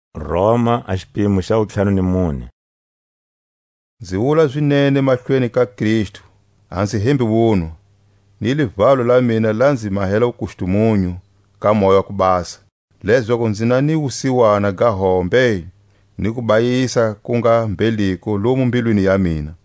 A vuIsraeli. Nzi wula zinene mahlweni ka Kristu, a nzi hembi wunwa, ni livalo la mina la nzi mahela wukustumunyu ka Moya wa ku Basa, lezaku nzi na ni wusiwana ga hombe ni kubayisa ku nga mbheliko lomu mbilwini ya mina.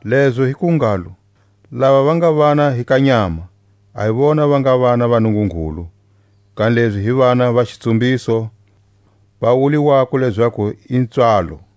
Lezo hi ku ngalo, lava va nga vana hi ka nyama, a hi vona va nga vana va Nungungulu; kanilezi hi vana va xitsumbiso va wuliwako lezaku i pswalo.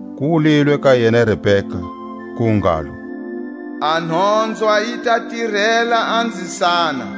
ku wulilwe ka yena Rebeka, ku ngalo; A nhonzwa yi ta tirela a nzisana.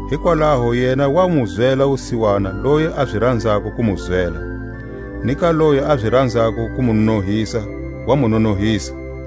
Hikwalaho yena wa mu zwela wusiwana loyi a zi ranzako ku mu zwela, ni ka loyi a zi ranzako ku mu nonohisa wa mu nonohisa.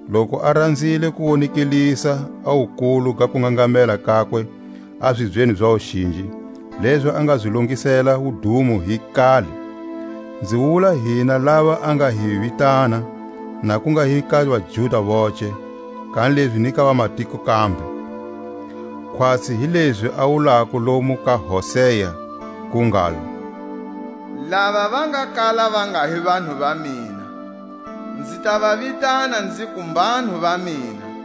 loku a ranzile ku wonekelisa a wukulu ga kungangamela kakwe a zibyeni za wuxinji, lezi a nga zi longisela wudumo hi kale? Nzi wula hina lava a nga hi vitana, na ku nga hi ka vaJuda voce, kanilezi ni ka vamatiko kambe. Khwatsi hi lezi a wulako lomu ka Hosea, ku ngalo: Lava va nga kala va nga hi vanhu va mina, Nzi ta va vitana nziku, Mbanhu va mina;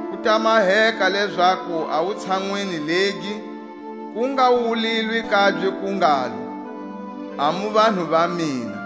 Ku ta maheka lezaku a wutshanwini legi ku nga wulilwe kabye ku ngalo: A mu vanhu va mina,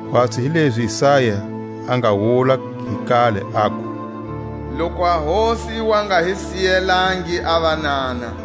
Khwatsi hi lezi Isaya a nga wula hi kale, aku: Loku a Hosi yi wa nga hi siyelangi a vanana,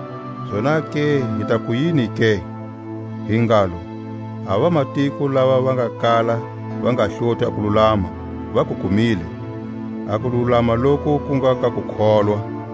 Zonake hi taku yini ke? Hi ngalo, a vamatiko lava va nga kala va nga hloti a kululama, va ku kumile, a kululama loku ku nga ka kukholwa.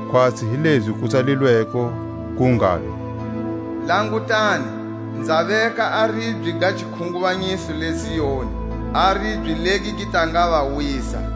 khwatsi hi lezi ku tsalilweko, ku ngalo: Langutani, nza veka a ribye ga xikhunguvanyiso le Zioni, A ribye legi gi ta nga va wisa;